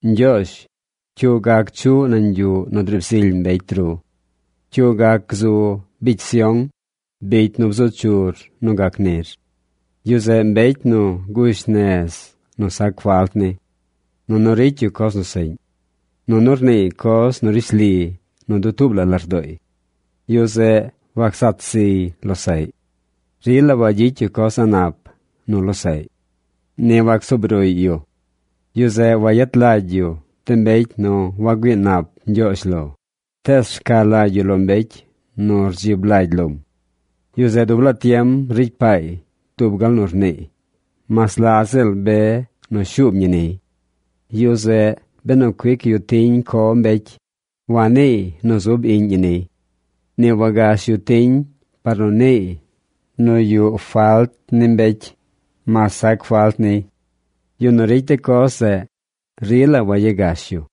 Ñgyoozh, ¿cyu gac chuꞌ nañ yuꞌ nu driib zily mbecy ru? ¿Cyu gac gzu bicy Sión, bicy nu bzu chur nu gac nir? Yu zeꞌ mbecy nu gush nez nu sac falt ni. Nunu ricy yu coz nu seꞌñ. Nunu rniiy coz nu rishli nu dutuub la lardooy. Yu zeꞌ wacsat ziy losaꞌy. Rila wagyicy yu coz a̱ꞌ nap nu losaꞌy. Ni wacsuub ruꞌy yu. Yu zeꞌ wayet lagy yu de mbecy nu wagüii nap Ñgyoozh lo, tees rca lagy yu lo mbecy nu rdzib lagy lom. Yu zeꞌ dub laa tiem ricy paay dub gal nu rniiy mas la ziꞌl be nu shuub ñi niy. Yu zeꞌ benu cuic yu tiñ co mbecy, waniiy nu zub iꞌñ ñi niy. Ni wagash yu tiñ par nu niiy nu yuꞌ falt ni mbecy mas sac falt niy. Yu nu ricy de coz zeꞌ, rila wayagash yu.